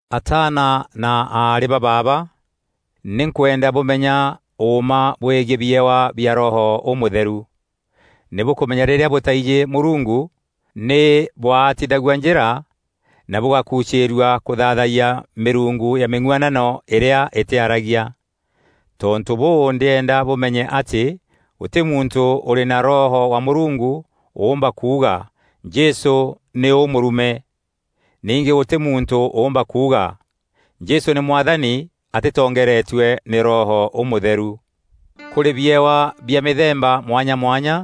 Ataana na aarî ba baaba, nî nkwenda bûmenya ûûma bwegiî biewa bia Roho Ûmûtheru. Nî bûkûmenya rîrîa bûtaijî Mûrungu nî bwaatithagua njîra na bûgakucîîrua kûthaathayia mîrungu ya mîng'uanano îrîa îtîaragia. Tontû bûû ndîenda bûmenye atî gûtî muntû ûrî na Roho wa Mûrungu ûûmba kuuga, “Jesû nî ûûmûrume!” Ningî gûtî muntû ûûmba kuuga, “Jesû nî Mwathani” atîtongeeretue nî Roho Ûmûtheru. Kûrî biewa bia mîthemba mwanya mwanya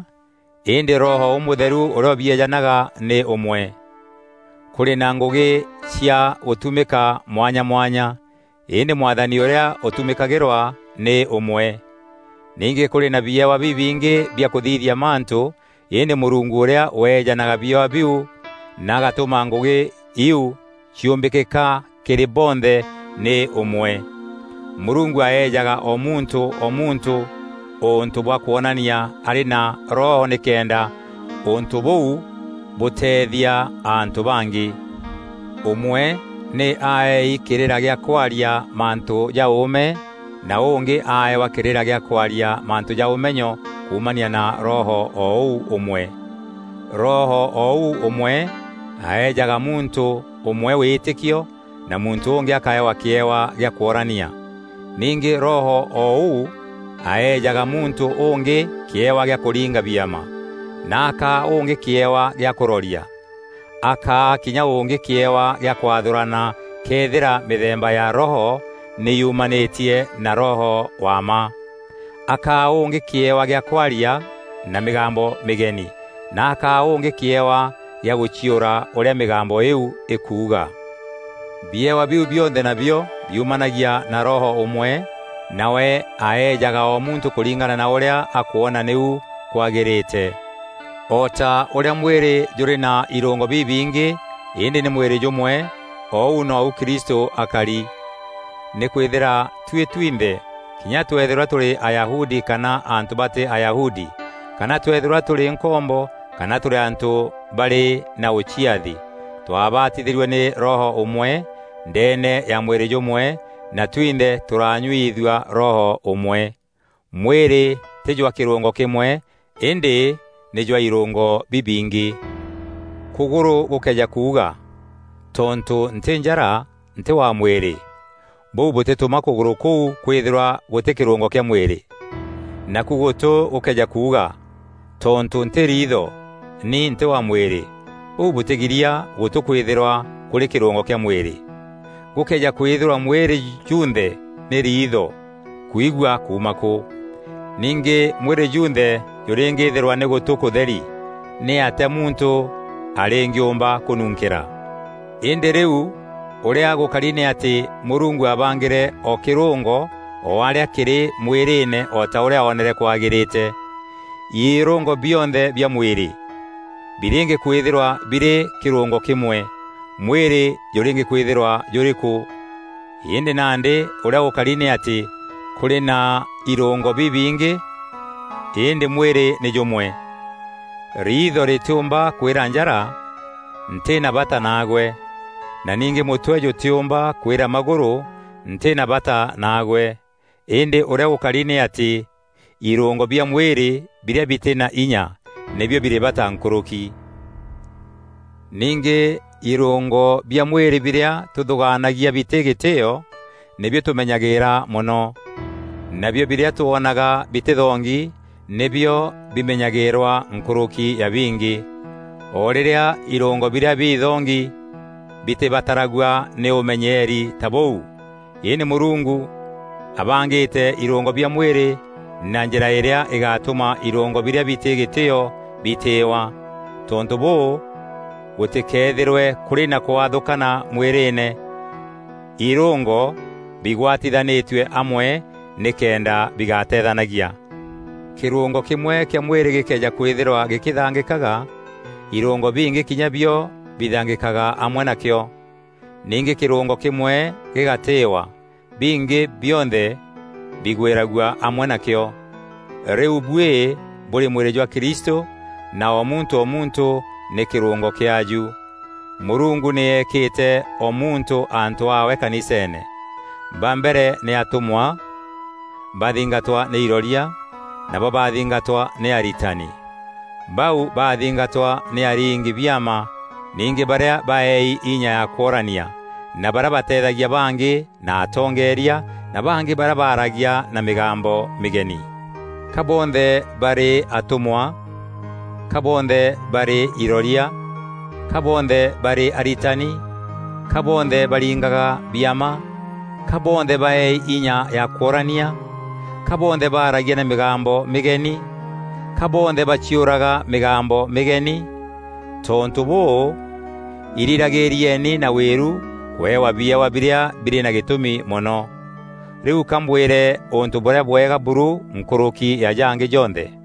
îndî Roho Ûmûtheru ûrîa ûbieejanaga nî ûmwe. Kûrî na ngûgî cia gûtumîka mwanya mwanya îndî Mwathani ûrîa ûtumîkagîrwa nî ûmwe. Ningî kûrî na biewa bibingî bia kûthithia mantû îndî Mûrungu ûrîa weejanaga biewa biu na agatûma ngûgî iu ciûmbîkîka kîrî bonthe nî ûmwe. Mûrungu aejaga o muntû o muntû ûntû bwa kwonania arî na Roho nîkenda ûntû bûu bûteethia antû bangî. Ûmwe nî aeei kîrîra gîa kwaria mantû ja ûûme na ûngî aeewa kîrîra gîa kwaria mantû ja ûmenyo kuumania na Roho o ûu ûmwe. Roho o ûu ûmwe aejaga muntû ûmwe wîtîkio na muntû ûngî akaewa kîewa gîa kworania. Ningî Roho o ûu aejaga muntû ûngî kîewa gîa kûringa biama, na akaa ûngî kîewa gîa kûroria. Akaa kinya ûngî kîewa gîa kwathûrana këethîra mîthemba ya Roho nî yumanîtie na Roho wa mma. Akaa ûngî kîewa gîa kwaria na mîgambo mîgeni na akaa ûngî kîewa gîa gûciûra ûrîa mîgambo îîu îkuuga. Biewa biu bionthe nabio biumanagia na Roho ûmwe, nawe aejaga o muntû kûringana na ûrîa akwona nîu kwagîrîte. O ta ûrîa mwîrî jûrî na irûngo bibingî îndî nî mwîrî jûmwe, o ûu nou Kristû akari. Nîkwîthîra tuî twinthe, kinya tweethîrwa tûrî Ayahudi kana antû batî Ayahudi kana tweethîrwa tûrî nkombo kana tûrî antû barî na ûciathi, twabatithîrue nî Roho ûmwe, ndeene ya mwîrî jûmwe na twinthe tûranyuithua Roho ûmwe. Mwîrî tî jwa kîrûngo kîmwe îndî nî jwa îrûngo bibingî. Kûgûrû gûkëeja kuuga, “Tontû ntî njara, ntî wa mwîrî,” bûu bûtîtûma kûgûrû kûu kwîthîrwa gûtî kîrûngo kîa mwîrî. Naku gûtû gûkëeja kuuga, “Tontû ntî riitho, ni ntî wa mwîrî,” bûu bûtîgiria gûtû kwîthîrwa kûrî kîrûngo kîa mwîrî. Gûkëeja kwîthîrwa mwîrî junthe nî riitho, kwigua kuuma kû? Ningî mwîrî junthe jûrîngîthîrwa nî gûtû kûtheri, nîatîa muntû arîngîuûmba kûnunkîra? Îndî rîu ûrîa gûkari nî atî Mûrungu aabangîre o kîrûngo o arîa kîrî mwîrîîne o ta ûrîa oonere kwagîrîte. Irûngo bionthe bia mwîrî birîngîkwîthîrwa birî kîrûngo kîmwe, mwîrî jûrîngîkwîthîrwa jûrî kû? Îndî nandî ûrîa gûkari nî atî kûrî na îrûngo bibingî îndî mwîrî nî jûmwe. Riitho rîtîûmba kwîra njara, “Ntî na bata naagwe,” na ningî mûtwe jûtîûmba kwîra magûrû, “Ntî na bata naagwe.” Îndî ûrîa gûkari nî atî irûngo bia mwîrî birîa bitî na inya nîbio birî bata nkûrûki. Ningî irûngo bia mwîrî birîa tûthûgaanagia bitî gîtîîo, nîbio tûmenyagîîra mono. Nabio birîa twoonaga bitîthongi, nîbio bimenyagîîrwa nkûrûki ya bingî, o rîrîa irûngo birîa bithongi bitîbataragua nî ûmenyeeri ta bûu. Îndî Mûrungu abangîte irûngo bia mwîrî na njîra îrîa îgatûma irûngo birîa bitî gîtîîo bitîîwa. Tontû bûû gûtîkeethîrwe kûrî na kwathûkana mwîrîîne, îrûngo bigwatithanîtue amwe nîkenda bigateethanagia. Kîrûngo kîmwe kîa mwîrî gîkëeja kwîthîrwa gîkîthangîkaga, irûngo bingî kinya bio bithangîkaga amwe nakîo. Ningî kîrûngo kîmwe gîgatîîwa, bingî bionthe bigwîragua amwe na kîo. Rîu buî bûrî mwîrî jwa Kristû na o muntû o muntû nî kîrûngo kîaaju. Mûrungu nî eekîte o muntû antû aawe kaniseene. Ba mbere nî atûmwa bathingatwa nî iroria nabo bathingatwa nî aritani. Bau bathingatwa nî aringi-biama, ningî barîa baeei inya ya kworania na barîa bateethagia bangî na atongeria na bangî barîa baragia na mîgambo mîgeni. Ka bonthe barî atûmwa? Ka bonthe barî iroria? Ka bonthe barî aritani? Ka bonthe baringaga biama? Ka bonthe baeei inya ya kworania? Ka bonthe baragia na mîgambo mîgeni? Ka bonthe baciûraga mîgambo mîgeni? Tontû bûû, irîragîîrieni na wîru kûewa biewa birîa birî na gîtûmi mono. Rîu kambwîre ûntû bûrîa bwega buru nkûrûki ya jangî jonthe.